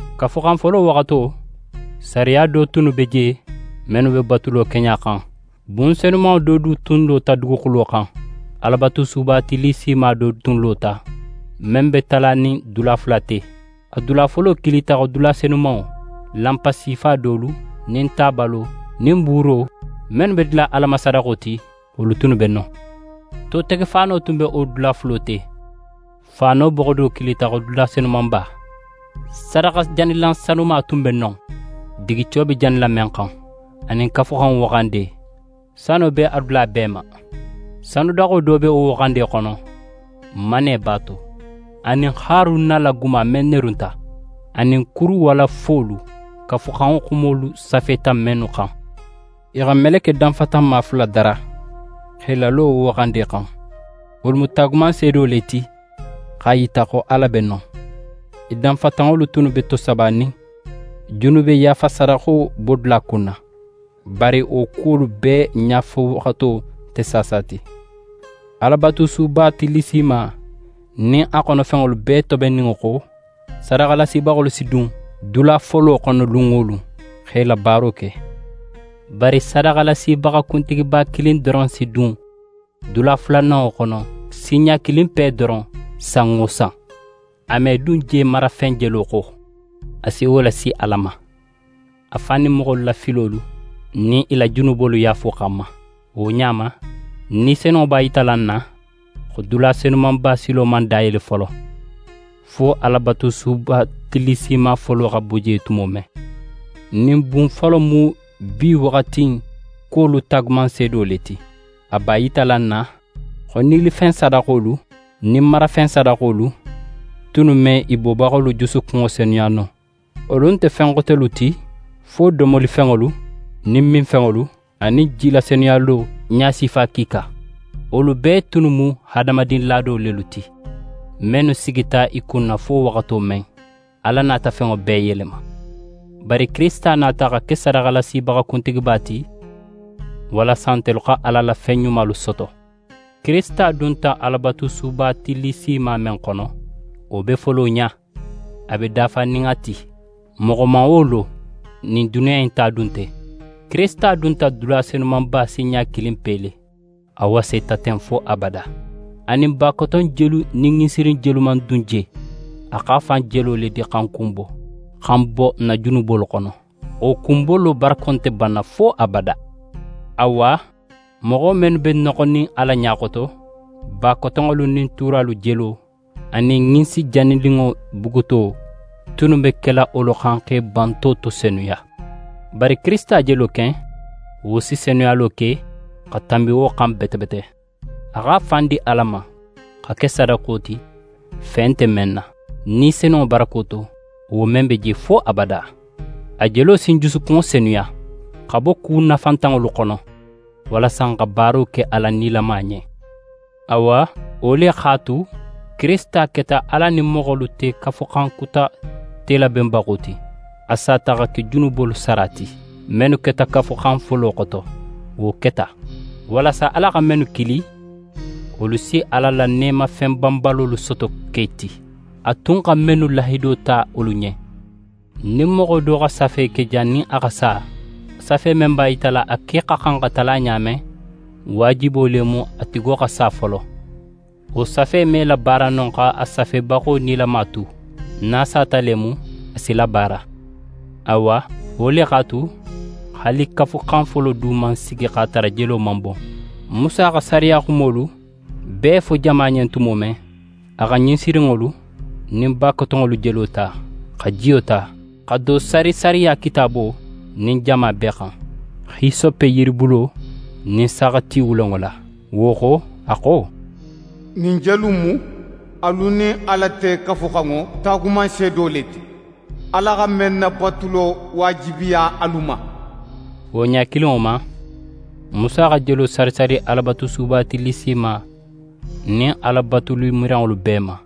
Kafuxan folo waxato, sariya do tunnu be je, mennu be batulo keɲa xan. Bun senumanŋo do du tun lota duguxulo xan. Alabatusuba tillisima do tun lota, men be talanin dula fula ti. A dula folo kilita xo dula Senumanŋo. Lanpa sifa dolu, nin tabalo, nin buuro mennu be dila Ala ma sadaxo ti, wolu tunnu be non. Totegefaano tun be wo dula fulo te. Faano boxo do kilita xo dula Senumanba. Sadaxajanilan sanuma tun be non, digico be janila men xan, anin Kafuxanŋo waxande; sano be a dula bee ma. Sanudaxo do be wo waxande xono, manne b'a to, anin Haruna la guma men nerunta, anin kuru walafolu, Kafuxanŋo xumolu safeta mennu xan. I xa meleke danfatanma fula dara, x'e lalo wo waxande xan. Wolu mu taagumanseedo le ti x'a yita xo Ala be non. I danfatanŋolu tunnu be tosabanin junube yaafa sadaxo bodula kunna. Bari wo kuwolu bee ɲafowaxato nte saasa ti. Alabatusuba tillisima nin a xonofenŋolu bee tobenninŋo xo, sadaxalasibaxolu si dun dula folo xono lun wo lun, xa i la baaro ke. Bari sadaxalasibaxa kuntigiba kilin doron si dun dula fulananŋo xono sinɲa kilinpe doron san wo san. A me dun je marafen jelo xo. A si wo lasi Ala ma, a fan nin moxolu la filolu nin i la junubolu yaafo xanma. Wo ɲa ma, Ni Senunŋo b'a yitala n na, xo dula Senumanba silo man dayele folo, fo Alabatusuba tillisima folo xa bo je tumo men. Ɲin bun folo in mu bi waxati in kuwolu taagumanseedo le ti. A b'a yitala n na xo nilifen sadaxolu nin marafen sadaxolu tunnu me i bobaxolu jusukunŋo senuya no. Wolu nte fen xotelu ti fo domolifenŋolu nin minfenŋolu, anin jilasenuyalo ɲasifa kiika. Wolu bee tunnu mu hadamadin laado lelu ti, mennu sigita i kunna fo waxato men, Ala nata fenŋo bee yelema. Bari Kirisita nata xa ke sadaxalasibaxa kuntigiba ti, walasa ntelu xa Ala la fen ɲumalu soto. Kirisita dunta Alabatusuba tillisima men xono, wo be folo ɲa, a be dafanin a ti. Moxo man wo lo, ɲin duniya in ta du nte. Kirisita dunta dula Senumanba sinɲa kilinpe le. A waseta ten fo abada. A nin bakoton jelu nin ɲinsirin jelu man dun je. A x'a fan jelo le di xa n kunbo, xa n bo n na junubolu xono. Wo kunbolo barako nte banna fo abada. Awa, moxo mennu be noxonin Ala ɲa xoto, bakotonŋolu nin tuuralu jelo anin ɲinsi janininŋo buguto tunnu be kela wolu xan x'e banto to senuya. Bari Kirisita jelo ken, wo si senuyalo ke xa tanbi wo xan bete bete. A x'a fan di Ala ma, xa ke sadaxo ti, fe nte men na, Ni Senunŋo barako to, wo men be je fo abada. A jelo si n jusukunŋo senuya xa bo ku nafantanŋolu xono, walasa n xa baaro ke Ala nilama ɲen. Awa, wo le x'a tu, Kirisita keta Ala nin moxolu te Kafuxan Kuta telabenbaxo ti. A sata xa ke junubolu sara ti, mennu keta Kafuxan folo xoto. Wo keta, walasa Ala xa mennu kili, wolu si Ala la neemafen banbalolu soto ke ti, a tun xa mennu lahido ta wolu ɲen. Nin moxo do xa safe ke jannin a xa sa, safe men b'a yitala a ke xa xan xa tala ɲa men, waajibo le mu a tigo xa sa folo. Wo safe me labaara no x'a safebaxo nilama tu. Nin a sata le mu a si labaara. Awa, wo le x'a tu, haali Kafuxan folo du man sigi x'a tara jelo man bon. Musa xa sariya xumolu bee fo jama ɲen tumo men, a xa ɲinsirinŋolu nin bakotonŋolu jelo ta, xa jiyo ta, xa do sari sariya Kitaabo nin jama bee xan, hisope yiribulo nin saaxati wulenŋo la. Wo xo, a xo: «Ɲin jelu in mu alu nin Ala te Kafuxanŋo taagumanseedo le ti, Ala xa men nabatulo waajibiya alu ma.» Wo ɲa kilinŋo ma, Musa xa jelo sari sari Alabatusuba tillisima nin Ala batulimiranŋolu bee ma.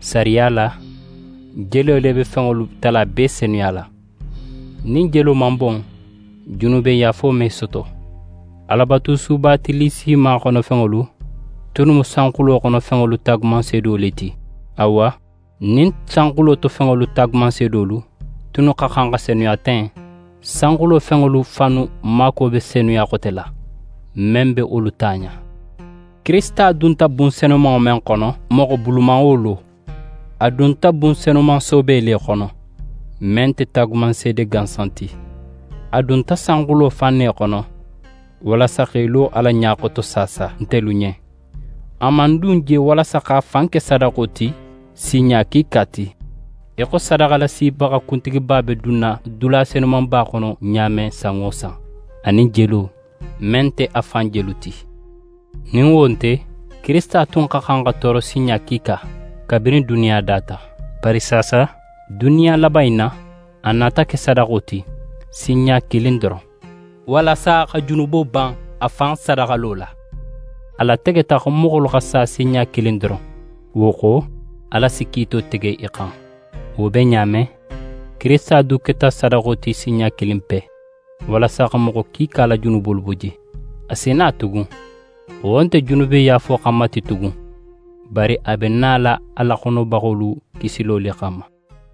Sariya la, jelo le be fenŋolu tala bee senuyala. Nin jelo man bon, junubeyaafo me soto. Alabatusuba tillisima xonofenŋolu tunnu mu sanxulo xono fenŋolu taagumanseedo le ti. Awa, nin sanxulo to fenŋolu taagumanseedolu tunnu xa xan xa senuya ten, sanxulo fenŋolu fannu maakuwo be senuya xote la, men be wolu ta ɲa. Kirisita dunta bun senumanŋo men xono, moxo bulu man wo lo. A dunta bun senuman soobe le xono, men nte taagumanseede gansan ti. A dunta sanxulo fan ne xono, walasa x'é lo Ala ɲa xoto saasa, ntelu ɲen. A man dun je walasa x'a fan ke sadaxo ti sinɲa kiika ti, í xo sadaxalasibaxa kuntigiba be dunna dula Senumanba xono ɲa men san wo san, a nin jelo, men nte a fan jelu ti. Nin wo nte, Kirisita tun xa xan xa tooro sinɲa kiika, kabirin duniya data. Bari saasa, duniya laban in na, a nata ke sadaxo ti sinɲa kilin doron, walasa xa junubo ban a fan sadaxalo la. A lategeta xo moxolu xa sa sinɲa kilin doron, wo xo, Ala si kiito tege i xan. Wo be ɲa men, Kirisita du keta sadaxo ti sinɲa kilinpe, walasa xa moxo kiika la junubolu bo je. A si na tugun; wo nte junubeyaafo xanma ti tugun, bari a be nala a laxonobaxolu kisilo le xanma.